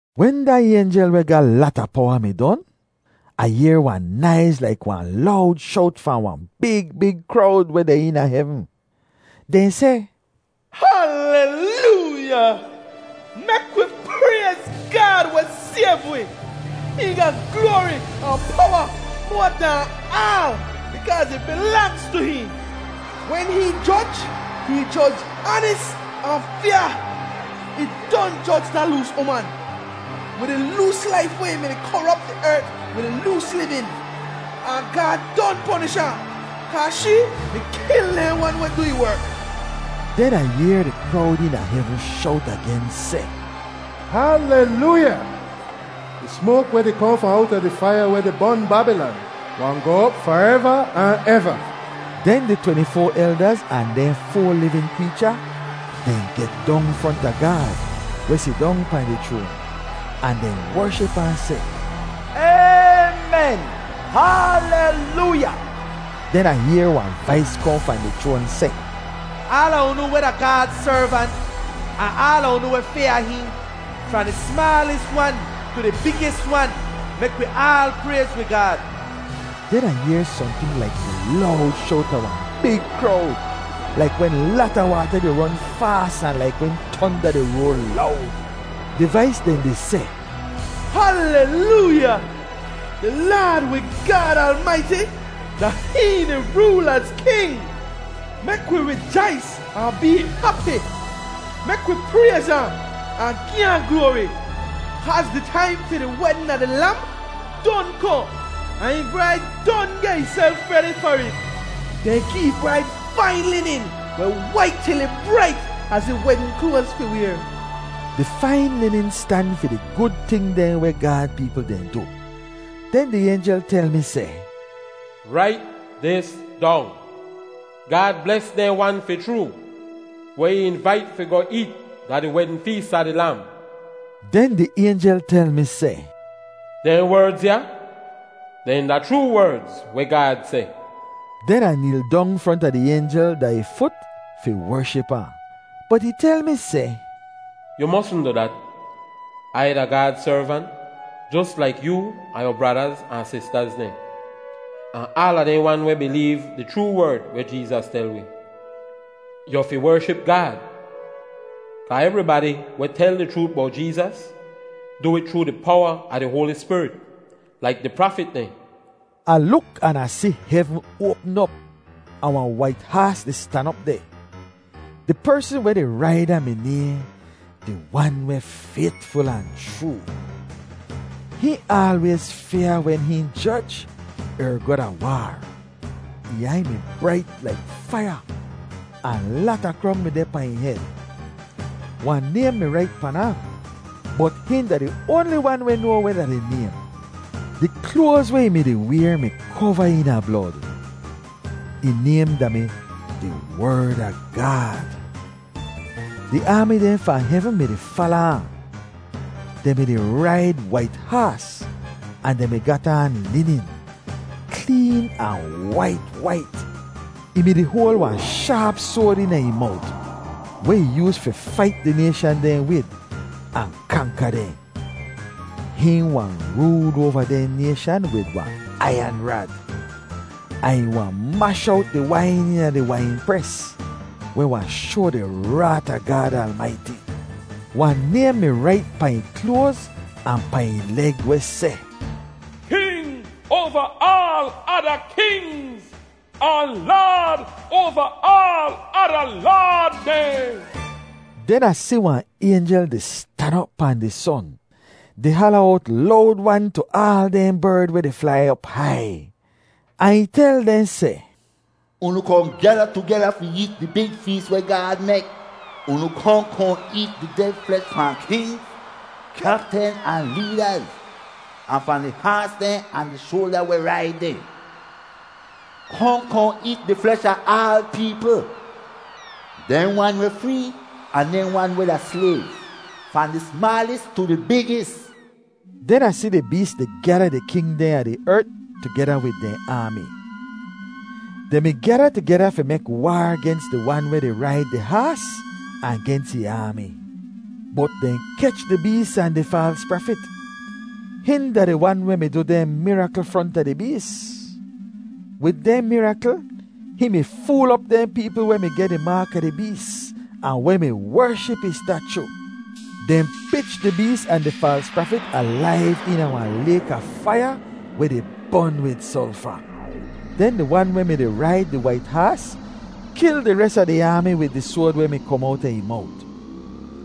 Wen da aynjel weh ga lata powa mi don, Ah yehr wahn naiz laik wahn lowd showt fahn wahn big, big krowd weh deh eena hevn. Dehn seh, “Halelooya! Mek wi prayz Gaad weh sayv wi! Hihn ga gloari ahn powa moa dahn aal bikaaz ih bilangz tu hihn! Wen hihn joj, hihn joj aanis ahn fyaa! Ih don joj da loos uman, wid ih loos laif weh mi-di korop di ert wid ih loos livin, ahn Gaad don ponish ahn, kaa shee mi kil dehn wan weh du ih werk.” Den Ah yehr di krowd eena hevn showt agen seh, “Halelooya! Di smoak weh di kohn fahn owta di faiya weh di bon Babilan wahn goh op fareva ahn eva.” Den di tweni-foa eldaz ahn dehn foa livin kreecha, dehn get dong fronta Gaad, weh sidong pahn di chroan, ahn dehn wership ahn seh, “Aymen, Halelooya!” Den Ah yehr wahn vais kohn fahn di chroan seh, “Aala unu weh da Gaad servant ahn aala unu weh fyaa hihn, fahn di smaalis wan tu di bigis wan, mek wi aal prayz wi Gaad!” Den Ah yehr sohnting laik di lowd showt a wahn big krowd, laik wen lata waata di ron faas ahn laik wen tonda di roar lowd. Di vais dehn di seh, “Halelooya! Di Laad wi Gaad Almaiti, da hihn di rool az king! Mek wi rijais ahn bee hapi. Mek wi prayz ahn, ahn gi ahn gloari! Kaaz di taim fi di wedn a di Lam don kohn, ahn ih braid don geh ihself redi far it. Dehn gi di braid fain linin weh wait til ih brait az ih wedn kloaz fi wayr.” Di fain linin stan fi di gud ting dehn weh Gaad peepl dehn du. Den di aynjel tel mi seh, “Rait dis dong: Gaad bles dehn wan fi chroo weh ih invait fi goh eet da di wedn fees a di Lam.” Den di aynjel tel mi seh, “Dehn werdz ya dehn da chroo werdz weh Gaad seh.” Den Ah neel dong fronta di aynjel da ih fut fi wership ahn. Bot ih tel mi seh, “Yu mosn du dat! Ai da Gaad servant jos laik yoo ahn yu bradaz ahn sistaz dehn, ahn aala dehn wan weh bileev di chroo werd weh Jeezas tel wi! Yu fi wership Gaad! Kaa evribadi weh tel di chroot bowt Jeezas du it chroo di powa a di Hoali Spirit, laik di prafit dehn.” Ah luk an Ah si hevn oapm op, ahn wahn wait haas di stan op deh. Di persn weh di raid ahn mi nayhn “Di Wan weh Faytful ahn Chroo.” Hihn aalwayz fyaa wen hihn joj er goh da waar. Ih aiy mi brait laik faiya, ahn lata krong mi deh pahn ih hed. Wahn naym mi rait pan ahn, bot hihn da di oanli wan weh noa weh da di naym. Di kloaz weh ih mi-di wayr mi kova eena blod. Ih naym da-mi “Di Werd a Gaad.” Di aami dehn fahn hevn mi-di fala ahn. Dehn mi-di raid wait haas ahn dehn mi gat aan linin, kleen ahn wait wait. Ih mi-di hoal wahn shaap soad eena ih mowt, weh ih yooz fi fait di nayshan dehn wid, ahn kanka dehn. “Hihn wahn rool oava dehn nayshan wid wahn aiyan rad.” Ahn ih wahn mash owt di wain eena di wainpres, weh wahn shoa di raat a Gaad Almaiti. Wahn naym mi rait pahn ih kloaz ahn pahn ih leg weh seh: King oava aal ada kingz Ahn laad oava aal ada laad dehn. Den Ah si wahn aynjel di stan op pahn di son, di hala owt lowd-wan tu aal dehn berd weh di flai op hai, ahn ih tel dehn seh, “Unu kohn gyada tugeda fi eet di big fees weh Gaad mek! Unu kohn kohn eet di ded flesh fahn kingz, kyaptin, ahn leedaz, ahn fahn di haas dehn ahn di soalja weh raid dehn. Kohn kohn eet di flesh a aal peepl—dehn wan weh free ahn dehn wan weh da slayv, fahn di smaalis tu di bigis.” Den Ah si di bees di gyada di king dehn a di ert tugeda wid dehn aami. Dehn mi gyada tugeda fi mek waar gens di wan weh di raid di haas ahn gens ih aami. Bot dehn kech di bees ahn di faals prafit. Hihn da di wan weh mi du dehn mirakl fronta di bees. Wid dehn mirakl hihn mi fool op dehn peepl weh mi geh di maak a di bees ahn weh mi wership ih stachu. Dehn pich di bees ahn di faals prafit alaiv eena wahn layk a faiya weh di bon wid solfa. Den di wan weh mi-di raid di wait haas kil di res a di aami wid di soad weh mi kom owta ih mowt.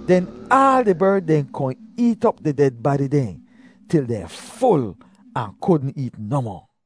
Den aal di berd dehn kohn eet op di ded badi dehn til dehn ful ahn kudn eet nohmoh.